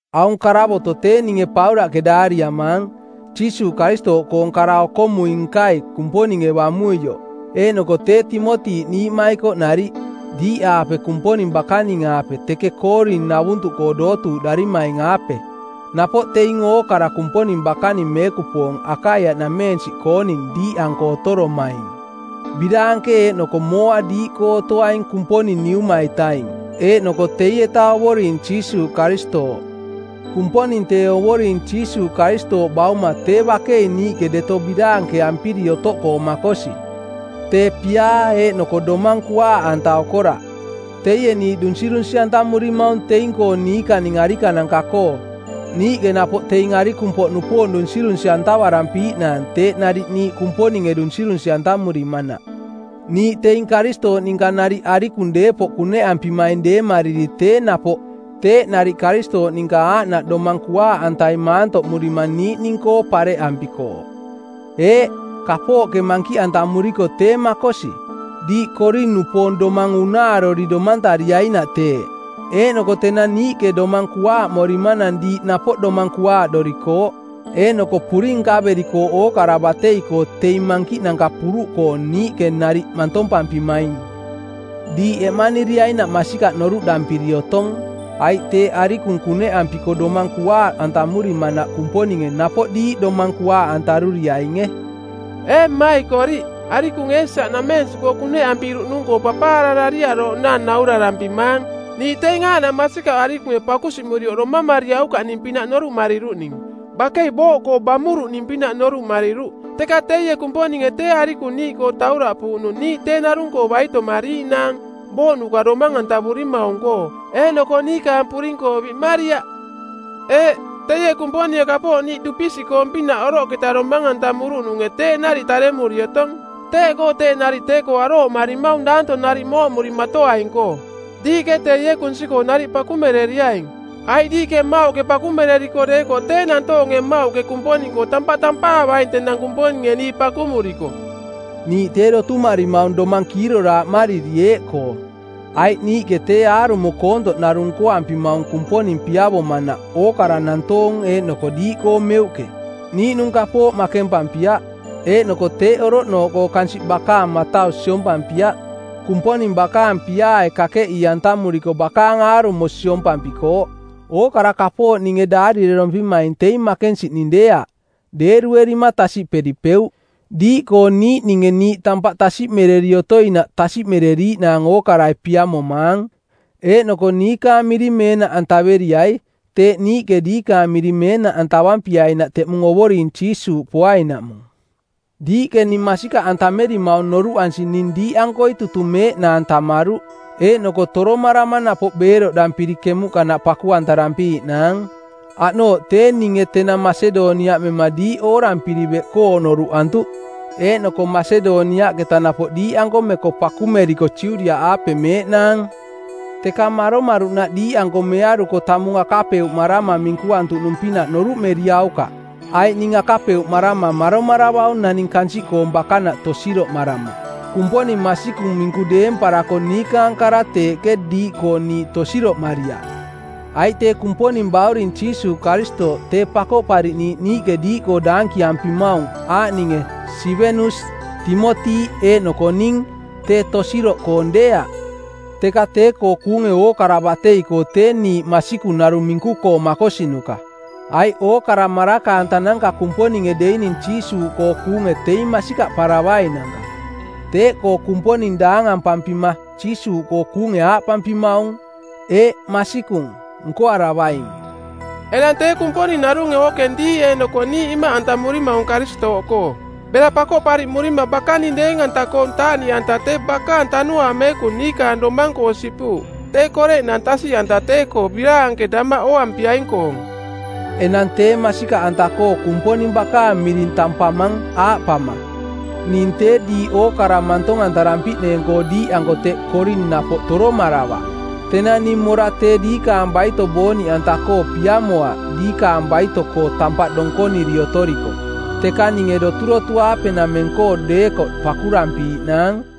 Aung karavoto˜ tee ninge Paulaꞌke daariamaang, Jiisuuꞌ Karistooꞌkoong kara-okomui-nkai Kumponinge bamuioꞌ, eeꞌnoko tee Timoti niiꞌmaikoꞌ nariꞌ, diiꞌaape Kumponing bakaning-aape teke Koorin-navuntuꞌkoo dootuuꞌdarimaing-aape, napoꞌ teing ookara Kumponing bakaning meekupoong Akaiaꞌnamensiꞌkooning diiꞌanko otoromaing. Biraanke eeꞌnoko mooa diiꞌkoo otoaing Kumponing Niuma-itaing eeꞌnoko teieta Ovoring Jiisuuꞌ Karistooꞌ. Kumponing tee Ovoring Jiisuuꞌ Karistooꞌ Bauma tee bakei niiꞌke deto biraankeampiri otoꞌkoo makosi, tee piaa eeꞌnoko domang kuaaꞌanta-koo okoraꞌ. Teie niiꞌ dunsirunsi˜antamurimaung teing-koo niikaning arikananka-koo niiꞌke napoꞌ teing arikung-poꞌnupoong dunsirunsi-antavarampiiꞌnaang teeꞌ nariꞌ niiꞌ Kumponinge dunsirunsi-antamurimanaꞌ. Niiꞌ teing Karistooꞌ ninka nariꞌ arikung deepoꞌ kuneꞌampimaing deemariri tee napoꞌ teeꞌ nariꞌ Karistooꞌ ninka aaꞌnaꞌ domang kuaaꞌantai maantoꞌmurima niiꞌning-koo pareꞌampikooꞌ. Eeꞌ, kapooꞌke mankiꞌantamuriko tee makosi, diiꞌ Koorin-nupoong domang unaarori domantariainaꞌ teeꞌ. Eeꞌnoko tenang niiꞌke domang kuaaꞌmorimanang diiꞌ napoꞌ domang kuaaꞌdorikooꞌ, eeꞌnoko puring nkaverikooꞌ ookara batei-koo teing mankiꞌnanka puruꞌkoong niiꞌke nariꞌ mantompampimaing. Diiꞌ eꞌmaniriainaꞌ masikaꞌ noruꞌdarampiri otong, aiꞌ teeꞌ arikung kuneꞌampiko domang kuaaꞌantamurimanaꞌ Kumponinge napoꞌ diiꞌ domang kuaaꞌantaruriainge. Ee mmaikoriꞌ, arikung Eesia-nameensiꞌkoo kuneꞌampiruꞌnung-koo papaararariarooꞌnaang naurarampimang. Niiꞌ teing aaꞌnaꞌ masikaꞌ arikunge pakusiꞌmurioꞌ domamariaukaꞌning-pinaꞌ noruꞌmariruꞌning. Bakei booꞌkoo bamuruꞌning-pinaꞌ noruꞌmariruꞌ, teka teie Kumponinge tee arikung niiꞌkoo tauraꞌpuuꞌnung niiꞌ tee narung-koo baitomariiꞌnaang booꞌnuka domang-antavurimaung-koo, eeꞌnoko niikaang puring-koo biꞌmariaꞌ. Eeꞌ, teie Kumponinge kapooꞌ niiꞌ dupisiꞌkoong-pinaꞌ oroꞌketa domang-antamuruꞌnunge teeꞌ nariꞌ taremuri otong. Teeꞌkoo teeꞌ nariꞌ tee-koo arooꞌmarimaung daanto nariꞌ mooꞌmurimatoaing-koo. Diiꞌke teie kunsi-koo nariꞌ pakumereriaing, aiꞌ diiꞌke mmauꞌke pakumereriko deekoꞌ tee nantoong mmauꞌke Kumponing-koo tampaꞌ tampaavaing tenang Kumponinge niiꞌ pakumuriko. Niiꞌ tee dotumarimaung domang kiiroraaꞌmariri eeꞌkoo: aiꞌ niiꞌke tee aarumo koontoꞌ narung nkoampimaung Kumponing piavomanaꞌ ookara nantoong eeꞌnoko diiꞌkoo meuꞌke, niiꞌnung kapooꞌ makempampiaꞌ, eeꞌnoko teeꞌ oroꞌnooꞌkoo kansiꞌ bakaang matau siompampiaꞌ, Kumponing bakaang piaae kakeꞌii-antamuriko bakaang aarumo siompampikooꞌ. Ookara kapooꞌ ninge daarirerompimaing teing makensiꞌning deeaꞌ, deeruerima tasiꞌperipeuꞌ. Diiꞌkoo niiꞌninge niiꞌ tampaꞌ tasiꞌmereri otoinaꞌ tasiꞌmeriiꞌnaang ookarai piamomaang. Eeꞌnoko niikaang miring meenaꞌantaveriai teeꞌ niiꞌke diikaang miring meenaꞌantavampiainaꞌ teꞌmung Ovoring Jiisuuꞌ poainaꞌmung. Diiꞌke ning masikaꞌantamerimaung noruꞌansi ning diiꞌankoi tutung meeꞌnaang tammaruꞌ eeꞌnoko toromarama napoꞌ beeroꞌdampiri kemuꞌkanaꞌ paku-antarampiiꞌnaang. Aꞌnooꞌ tee ninge tenang Masedoniaꞌ mema diiꞌ oorampiri beꞌkoo noruꞌantuꞌ eeꞌnoko Masedoniaꞌketa napoꞌ diiꞌanko meko pakumeriko Judiaꞌaape meeꞌnaang. Teketa maromaruꞌnaꞌ diiꞌanko mearuko tamung akapeuꞌmarama minkuantuꞌnung-pinaꞌ noruꞌmeriaukaꞌ, aiꞌ ning akapeuꞌmarama maromaravaung naning kansiꞌkoong bakanaꞌ tosiroꞌmarama. Kumponing masikung minku deemparako niikaang kara teeꞌke diiꞌkoo niiꞌ tosiroꞌmariaꞌ. Aiꞌ tee Kumponing Bauring Jiisuuꞌ Karistooꞌ tee Pakoꞌpariꞌniiꞌ niiꞌke diiꞌkoo daankiampimaung, aaꞌninge Sivenus, Timoti eeꞌnoko ning tee tosiroꞌkoong deeaꞌ, teka tee-koo kuunge ookara batei-koo tee niiꞌ masikung narung minku-koo makosinuka. Aiꞌ ookara maraka-antananka Kumponinge deining Jiisuuꞌkoo kuunge teing masikaꞌparavainanka. Teeꞌkoo Kumponing daangampampima Jiisuuꞌkoo kuunge aaꞌpampimaung, “Eeꞌ, masikung, nkoaravaing!” Enang tee Kumponing narunge ookeng diiꞌ eeꞌnoko niiꞌ imaꞌantamurimaung Karistooꞌkoo. Bera pakoꞌpariꞌmurima bakaning deeng-anta-koong taaꞌniꞌanta tee bakaang Tanuaang Meekung niikaang domang-koo sipuuꞌ tee koreꞌnang tasiꞌanta tee-koo biraanke damaꞌ ooampiaing-koong. Enang tee masikaꞌanta-koo Kumponing bakaang miring tampamang aaꞌpama: Ning tee diiꞌ orakaꞌ mantong-antarampiꞌneeng-koo diiꞌanko teꞌ Koorin napoꞌ toromaravaꞌ. Tenang ning mora tee diikaang baito booniꞌanta-koo piamoaꞌ diikaang baito-koo tampaꞌ donkoniri otoriko, teka ninge doturotu-aape-nameng-koo deekoꞌ pakurampiiꞌnaang.